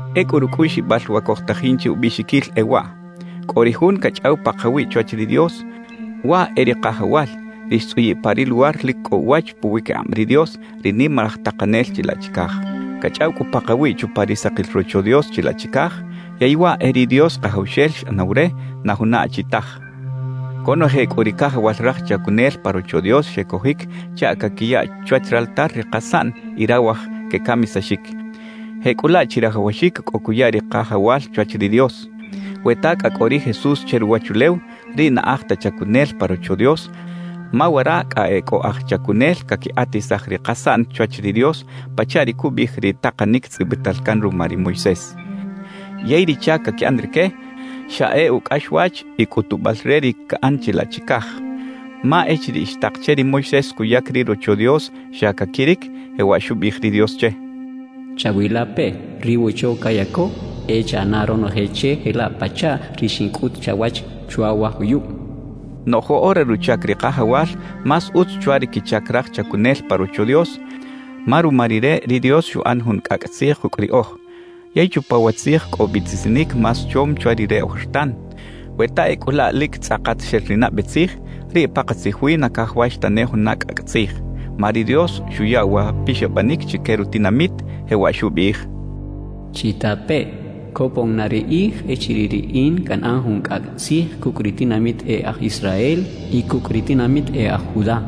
Ecꞌu rucꞌuꞌxibal wa cojtajin che ubiꞌxiquil e waꞌ: Cꞌo ri Jun cachꞌaw pakawiꞌ chwach ri Dios, waꞌ e ri Kajawal, ri xtzꞌuyiꞌ pa ri luwar lic cꞌo uwach puwiquikꞌab ri Dios, ri Nimalaj Takanel chilaꞌ chicaj. Cachꞌaw cꞌu pakawiꞌ chupa ri sakil Rocho Dios chilaꞌ chicaj; yey waꞌ e ri Dios Kajawxel xꞌanaw re, na juna achi taj. Conoje cꞌu ri cajawal raj chacunel pa Rocho Dios xecojic chaꞌ caquiya chwach raltar ri kasaꞌn y rawaj quecamisaxic. Jecꞌulaꞌ chirajawaxic cꞌo cuya ri Kajawal chwach ri Dios. We ta cꞌa cꞌo ri Jesús che ruwachulew, riꞌ na aj ta chacunel pa Rocho Dios, ma wara cꞌa e cꞌo aj chacunel caquikꞌatisaj ri kasaꞌn chwach ri Dios pachaꞌ ri cubiꞌij ri takanic tzꞌibital can ruma ri Moisés. Yey ri chac caquiꞌan rique, xa e ucꞌaxwach y cꞌutubal re ri caꞌan chilaꞌ chicaj. Ma echiriꞌ xtak che ri Moisés cuyac ri Rocho Dios xa caquiric, jewaꞌ xubiꞌij ri Dios che: Chawilapeꞌ, ri wocho cayaco, e chaꞌana ronoje che jelaꞌ pachaꞌ ri xincꞌut chawach chwa wa juyub xchaꞌ. Noꞌj woꞌora ruchac ri Kajawal más utz chwa ri quichac raj chacunel pa Rocho Dios, ma ruma Rire ri Dios xuꞌan jun cꞌacꞌ tzij kucꞌ riꞌoj. Yey chupa wa tzij cꞌo biꞌtisinic más chom chwa ri re ojertan. We ta ecꞌu laꞌ lic tzꞌakat xel ri nabe tzij, riꞌ pakatzij wi na cajawax tane juna cꞌacꞌ tzij. Ma ri Dios xuya wa pixabanic chique rutinamit, jewaꞌ xubiꞌij: ¡Chitapeꞌ! cacha ri Dios Kajawxel. Copon na ri kꞌij echiriꞌ Riꞌin canꞌan jun cꞌacꞌ tzij cucꞌ ri tinamit e aj Israel y cucꞌ ri tinamit e aj Judá.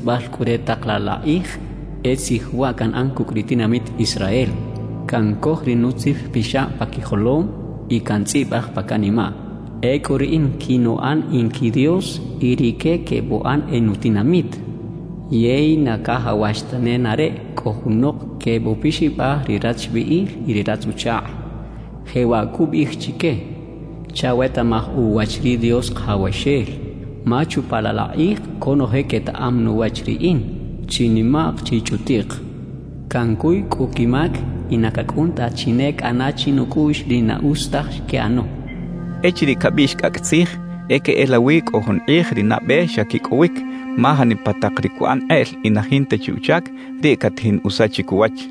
Qꞌuisbal cꞌu re tak laꞌ la kꞌij, e tzij waꞌ canꞌan cucꞌ ri tinamit Israel, cubiꞌij ri Dios Kajawxel: Cancoj ri nutzijpixab pa quijolom y cantzꞌibaj pa canimaꞌ. Ecꞌu Riꞌin quinuꞌan in qui Dios y rique quebuꞌan e nutinamit. Yey na cajawax ta nenareꞌ cꞌo junok quebupixabaj ri rachbiꞌil y ri ratz-uchakꞌ, jewaꞌ cubiꞌij chique: “Chawetaꞌmaj uwach ri Dios Kajawxel.” Ma chupa laꞌ la kꞌij conoje quetaꞌam nuwach Riꞌin, chinimaꞌk chichꞌutiꞌk. Cancuy cꞌu quimac y na cacꞌun ta chi ne cꞌana chinucꞌuꞌx ri na utz taj xquiꞌano xchaꞌ. Echiriꞌ cabiꞌx “cꞌacꞌ tzij”, e queꞌelawi cꞌo jun kꞌij ri nabe xa quicꞌowic, ma janipa tak ri cuꞌan kꞌeꞌl y na jinta chi uchac, riꞌ catajin usachic uwach.